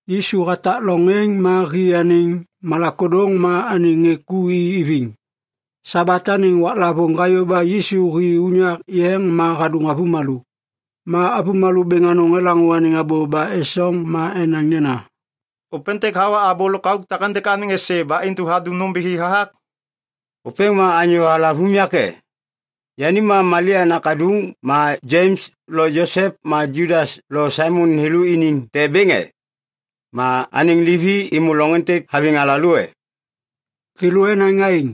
Yisu hatak loŋ êŋ ma hi anêŋ malak ôdôŋ ma anêŋ ŋê ku i iviŋ. Sabat anêŋ Waklavôŋ hayô ba Yisu hi unyak yeŋ ma hadôŋ avômalô. Ma avômalô bêŋ anôŋ elaŋô anêŋ abô ba esoŋ ma enaŋ nena, “Ôpêntêk hawa abô lôk auk takêntêk anêŋ êsê ba intu hadum nômbithi hathak? Ôpêŋ ma anyô halav unyak e? Yani ma Malia nakaduŋ ma Jems lo Josep ma Judas lo Saimon thêlô iniŋ te bêŋ e? Ma anêŋ livi êmô loŋ êntêk haviŋ alalô e?” Thêlô enaŋ aêŋ,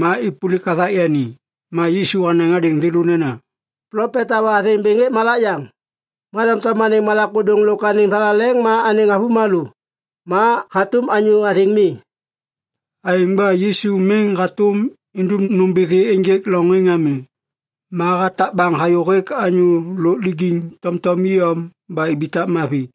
ma êpôlik hathak yani. Ma Yisu hanaŋ hadêŋ thêlô nena, “Plopet hawa athêŋ bêŋ hêk malak yaŋ. Ma doŋtom anêŋ malak ôdôŋ lôk anêŋ thalaleŋ ma anêŋ avômalô, ma hatôm anyô athêŋ mi.” Aêŋ ba Yisu miŋ hatôm idum nômbithi ênjêk loŋ êŋ ami, ma hatak baŋ hayô hêk anyô lôk lijiŋ tomtom iyom ba ibitak mavi.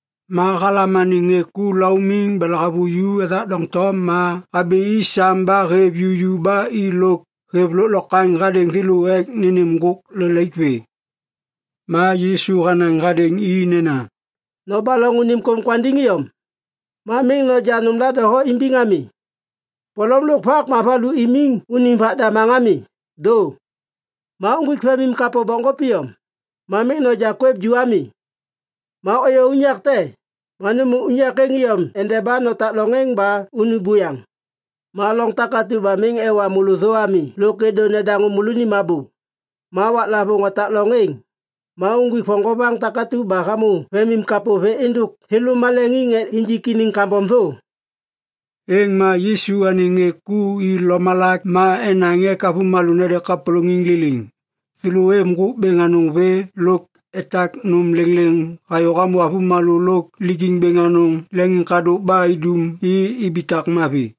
Ma halam anêŋ ŋê ku laumiŋ ba lahavuju ethak doŋtom ma habi i sam ba hêv juju ba i lôk hêv lôklokwaŋ hadêŋ thêlô ek nênêm ŋgôk lelaik vê. Ma Yisu hanaŋ hadêŋ i nena, “Nobaloŋ unim kôm kwandiŋ iyom. Ma miŋ noja nômla doho imbiŋ ami. Polom lôk vak ma valu imiŋ unim vak damaŋ ami, dô. Ma uŋgwik vemim kapô bokŋgôp iyom, ma miŋ noja kwêv ju ami. Ma ôyô unyak te, ma nômô unyak êŋ iyom endeba notak loŋ êŋ ba unu buyaŋ. Ma loŋ takatu ba miŋ ewa môlô thô ami lôk êdô nedaŋô môlônim abô, ma waklavôŋ otak loŋ êŋ, ma uŋgwik voŋgovaŋ takatu ba hamô vemim kapô vê êndôk thêlô maleŋiŋ ek injik iniŋ kambom thô.” Êŋ ma Yisu anêŋ ŋê ku i lomalak ma enaŋ ek avômalô nede kapôlôŋiŋ liliŋ. Thêlô êv ŋgôk bêŋ anôŋ vê lôk etak nôm lêŋlêŋ hayô hamô avômalô lôk lijiŋ bêŋ anôŋ leŋiŋkadôk ba idum i ibitak mavi.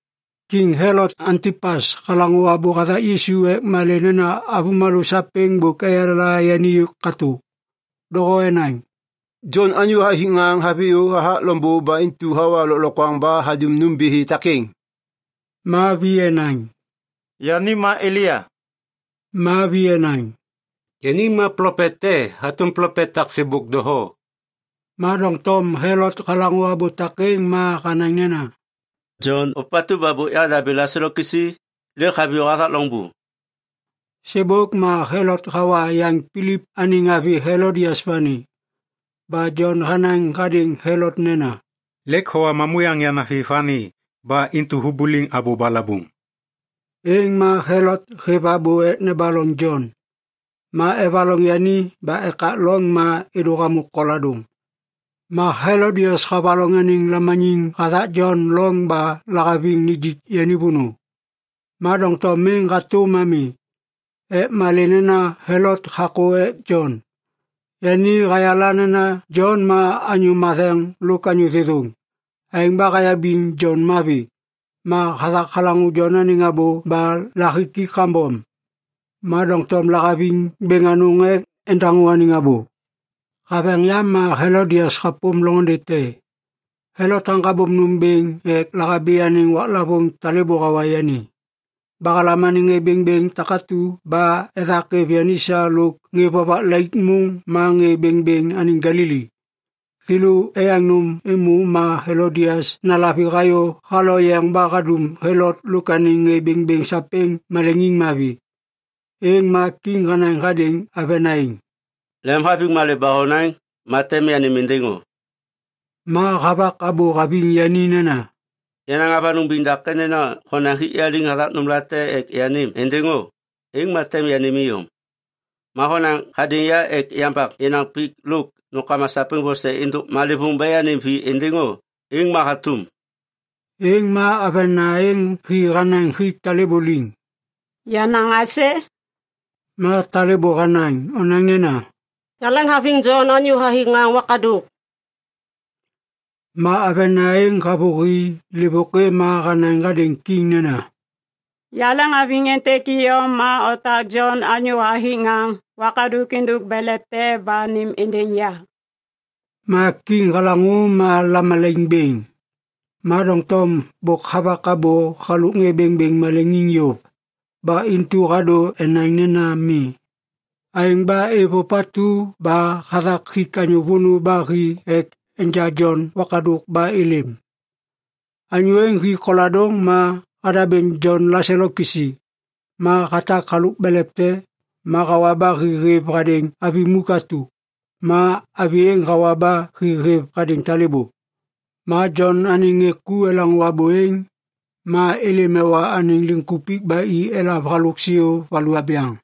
Kiŋ Helot Antipas halaŋô abô hathak Yisu ek malê nena avômalô sapêŋ bôk eyala yani katô. Doho enaŋ, “Jon anyô hathik ŋaŋ haviyô hathak loŋbô ba intu hawa lôklokwaŋ ba hadum nômbithi takêŋ.” Ma vi enaŋ, “Yani ma Elia.” Ma vi enaŋ, “Yani ma plopet te hatôm plopet tak sêbôk doho.” Ma doŋtom Helot halaŋô abô takêŋ ma hanaŋ nena, “Jon, ôpatu ba bôk yahadabêŋ laselo kisi, lêk haviyô hathak loŋbô!” Sêbôk ma Helot hawa yaŋ Pilip anêŋ avi Helodias vani. Ba Jon hanaŋ hadêŋ Helot nena, “Lêk howa mamuyaŋ yanavi vani ba intu hubuliŋ abô balabuŋ.” Êŋ ma Helot hêv abô ek nebaloŋ Jon. Ma evaloŋ yani ba ekak loŋ ma êdô hamô koladôŋ. Ma Helodias havaloŋ anêŋ lamaniŋ hathak Jon loŋ ba lahaviŋ nijik yani vônô, ma doŋtom miŋ hatôm ami, ek malê nena Helot hakô ek Jon. Yani hayala nena Jon ma anyô matheŋ lôk anyô thêthôŋ. Aêŋ ba hayabiŋ Jon mavi. Ma hathak halaŋô Jon anêŋ abô ba lahiki kambom, ma doŋtom lahaviŋ bêŋ anôŋ ek endaŋô anêŋ abô. Haveŋ yam ma Helodias hapôm loŋôndê te. Helot haŋgabôm nôm bêŋ ek lahabi anêŋ waklavôŋ talêbô hawa yani. Ba halam anêŋ ŋê bêŋbêŋ takatu ba ethak êv yani sa lôk ŋê vovak laik môŋ ma ŋê bêŋbêŋ anêŋ Galili. Thêlô eyaŋ nôm êmô ma Helodias nalavi hayô haloyeŋ ba hadum Helot lôk anêŋ ŋê bêŋbêŋ sapêŋ maleŋiŋ mavi. Êŋ ma kiŋ hanaŋ hadêŋ avena êŋ, “Lemhaviŋ malê ba honaŋ ma tem yanêm êndêŋ o.” Ma havak abô haviŋ yani nena, “Yanaŋ avanôŋ biŋ dake nena honaŋ hik ya liŋ hathak nômlate ek yanêm êndêŋ o, êŋ ma tem yanêm iyom. Ma honaŋ hadêŋ ya ek yambak yenaŋ pik lôk nômkama sapêŋ vose êndôk malêvôŋ ba yanêm vi êndêŋ o, êŋ ma hatôm.” Êŋ ma avena êŋ hi hanaŋ hik talêbô liŋ, “Yanaŋ aisê?” Ma talêbô hanaŋ, “Onaŋ nena, ‘Yaleŋhaviŋ Jon anyô hathik ŋaŋ wakadôk.’” Ma avena êŋ havôhi lêvôkê ma hanaŋ hadêŋ kiŋ nena, “Yaleŋhaviŋ êntêk iyom ma otak Jon anyô hathik ŋaŋ wakadôk êndôk belev te ba nêm êndêŋ ya.” Ma kiŋ halaŋô ma lamalaiŋ bêŋ, ma doŋtom bôk havak abô halôk ŋê bêŋbêŋ maleŋiŋ yôv. Ba intu hadô enaŋ nena mi. Aêŋ ba hêv ôpatu ba hathak hik anyô vônô ba hi ek enja Jon wakadôk ba êlêm. Anyô êŋ hi koladôŋ ma hadabêŋ Jon laselo kisi. Ma hatak halôk belev te, ma hawa ba hi hêv hadêŋ avi muk atu. Ma avi êŋ hawa ba hi hêv hadêŋ talêbô. Ma Jon anêŋ ŋê ku elaŋô abô êŋ, ma êlêm ewa anêŋ liŋkupik ba i elav halôk siô valu abyaŋ.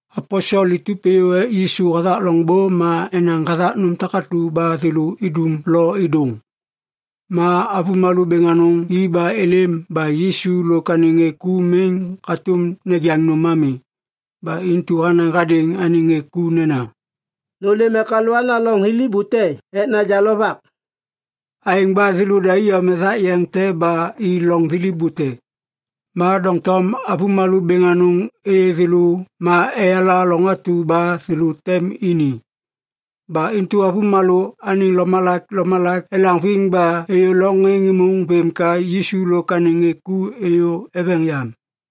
Aposel itup êyô ek Yisu hathak loŋbô ma enaŋ hathak nôm takatu ba thêlô idum lo êdôŋ. Ma avômalô bêŋ anôŋ i ba êlêm ba Yisu lôk anêŋ ŋê ku miŋ hatôm nejaŋ nôm ami. Ba intu hanaŋ hadêŋ anêŋ ŋê ku nena, “Nôlêm ek alôana loŋ thiliv bute ek naja lovak.” Aêŋ ba thêlôda iyom ethak yeŋ te ba i loŋ thiliv bute. Ma doŋtom avômalô bêŋ anôŋ êyê thêlô ma eyala loŋ atu ba thêlô tem ini. Ba intu avômalô anêŋ lomalak lomalak elaŋviŋ ba êyô loŋ êŋ êmôŋ vêm ka Yisu lôk anêŋ ŋê ku êyô eveŋ yam.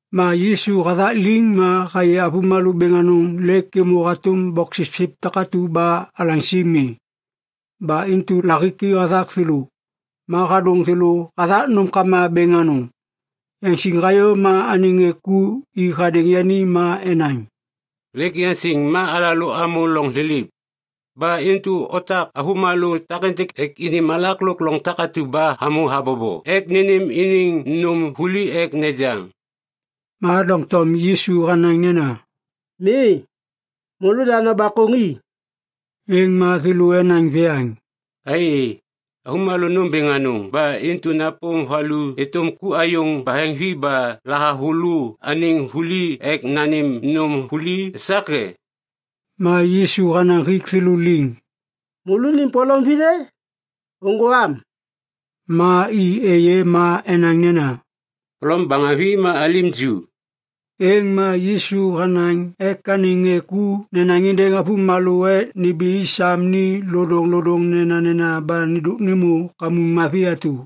Ma Yisu hathak liŋ ma hayê avômalô bêŋ anôŋ lêk êmô hatôm boksipsip takatu ba alaŋsi mi, ba intu lahiki hathak thêlô. Ma hadôŋ thêlô hathak nômkama bêŋ anôŋ. Yaŋsiŋ hayô ma anêŋ ŋê ku i hadêŋ yani ma enaŋ, “Lêk yaŋsiŋ ma alalô amô loŋ thiliv. Ba intu otak avômalô takêntêk ek ini malak lôk loŋ takatu ba hamô habobo ek nênêm iniŋ nôm vuli ek nejaŋ.” Ma doŋtom Yisu hanaŋ nena, “Mi, môlôda nobakôŋ i.” Êŋ ma thêlô enaŋ viyaŋ, “Ai, avômalô nômbêŋ anôŋ ba intu napôm valu êtôm ku ayôŋ baheŋvi ba lahavulô anêŋ vuli ek nanêm nôm vuli esak e?” Ma Yisu hanaŋ hik thêlô liŋ, “Môlônim polom vithê? Ôŋgô am.” Ma i êyê ma enaŋ nena, “Polom baheŋvi ma alim ju.” Êŋ ma Yisu hanaŋ ek anêŋ ŋê ku nenaŋ êndêŋ avômalô ek nimbi i sam ni lodôŋlodôŋ nenanena ba nêndôk nêmô kamuŋ mavi atu.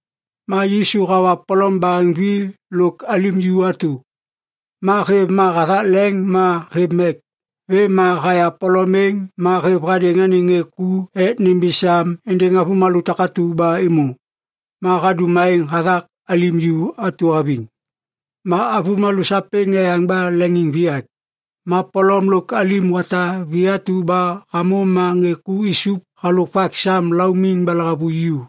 Ma Yisu hawa polom baheŋvi lôk alim ju atu. Ma hêv ma hathak leŋ ma hêv mek. Vêm ma haya polom êŋ ma hêv hadêŋ anêŋ ŋê ku ek nimbi sam êndêŋ avômalô takatu ba êmô. Ma hadum aêŋ hathak alim ju atu haviŋ. Ma avômalô sapêŋ eyaŋ ba leŋiŋviyak. Ma polom lôk alim wata vi atu ba hamô ma ŋê ku isup halôk vak sam laumiŋ ba lahavuju.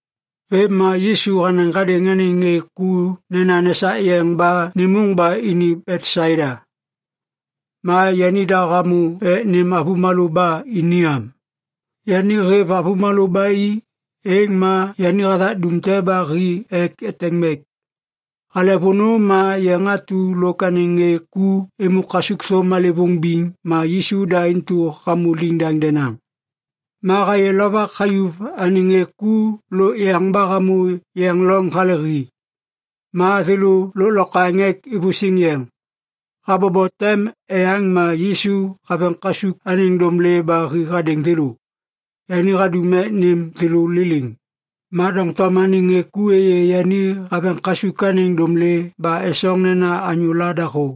Vêm ma Yisu hanaŋ hadêŋ anêŋ ŋê ku nena nesak yeŋ ba nêmôŋ ba ini Betsaida. Ma yanida hamô ek nêm avômalô ba ini am. Yani hêv avômalô ba i, êŋ ma yani hathak dum te ba hi ek eteŋ mek. Hale vônô ma yeŋ atu lôk anêŋ ŋê ku êmô kasukthôm malêvôŋ biŋ ma Yisu da intu hamô liŋdaŋ denaŋ. Ma hayê lovak hayuv anêŋ ŋê ku lôk yeŋ ba hamô yeŋ loŋ hale hi. Ma thêlô lôklokwaŋ ek ivusiŋ yeŋ. Habobo tem eyaŋ ma Yisu haveŋ kasuk anêŋ dômlê ba hi hadêŋ thêlô. Yani hadum ek nêm thêlô liliŋ, ma doŋtom anêŋ ŋê ku êyê yani haveŋ kasuk anêŋ dômlê ba esoŋ nena anyôla dahô.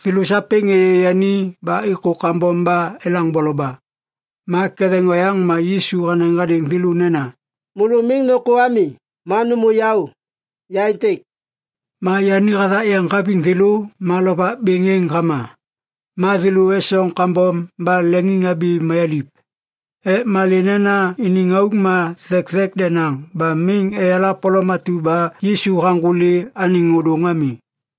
Thêlô sapêŋ êyê yani ba êkô kambom ba elaŋ boloba. Ma ketheŋ oyaŋ ma Yisu hanaŋ hadêŋ thêlô nena, “Môlô miŋ nôkô ami ma nômô yaô! Ya êntêk!” Ma yani hathak yeŋ haviŋ thêlô ma lovak bêŋ êŋ hama. Ma thêlô esoŋ kambom ba leŋiŋhabi mayaliv. Ek malê nena iniŋ auk ma thekthek denaŋ ba miŋ eyala polom atu ba Yisu haŋgôli anêŋ ôdôŋ ami.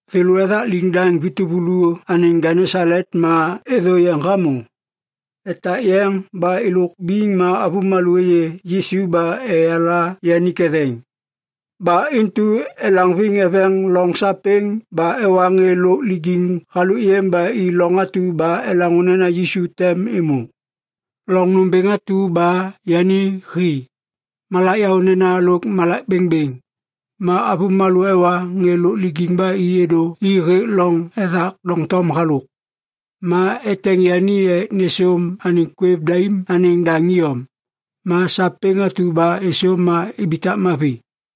Thêlô ethak liŋdaŋ vi tuvulu anêŋ Genesalet ma êthô yeŋ hamô. Etak yeŋ ba êlôk biŋ ma avômalô êyê Yisu ba eyala yani ketheŋ. Ba intu elaŋviŋ eveŋ loŋ sapêŋ ba ewa ŋê lôk lijiŋ halôk yêm ba i loŋ atu ba elaŋô nena Yisu tem êmô. Loŋ nômbêŋ atu ba yani hi, malak yaônena lôk malak bêŋbêŋ, ma avômalô ewa ŋê lôk lijiŋ ba i êdô i hêk loŋ ethak doŋtom halôk. Ma eteŋ yani ek nêsôm anêŋ kwêv daim anêŋ daŋ iyom. Ma sapêŋ atu ba êsôm ma ibitak mavi.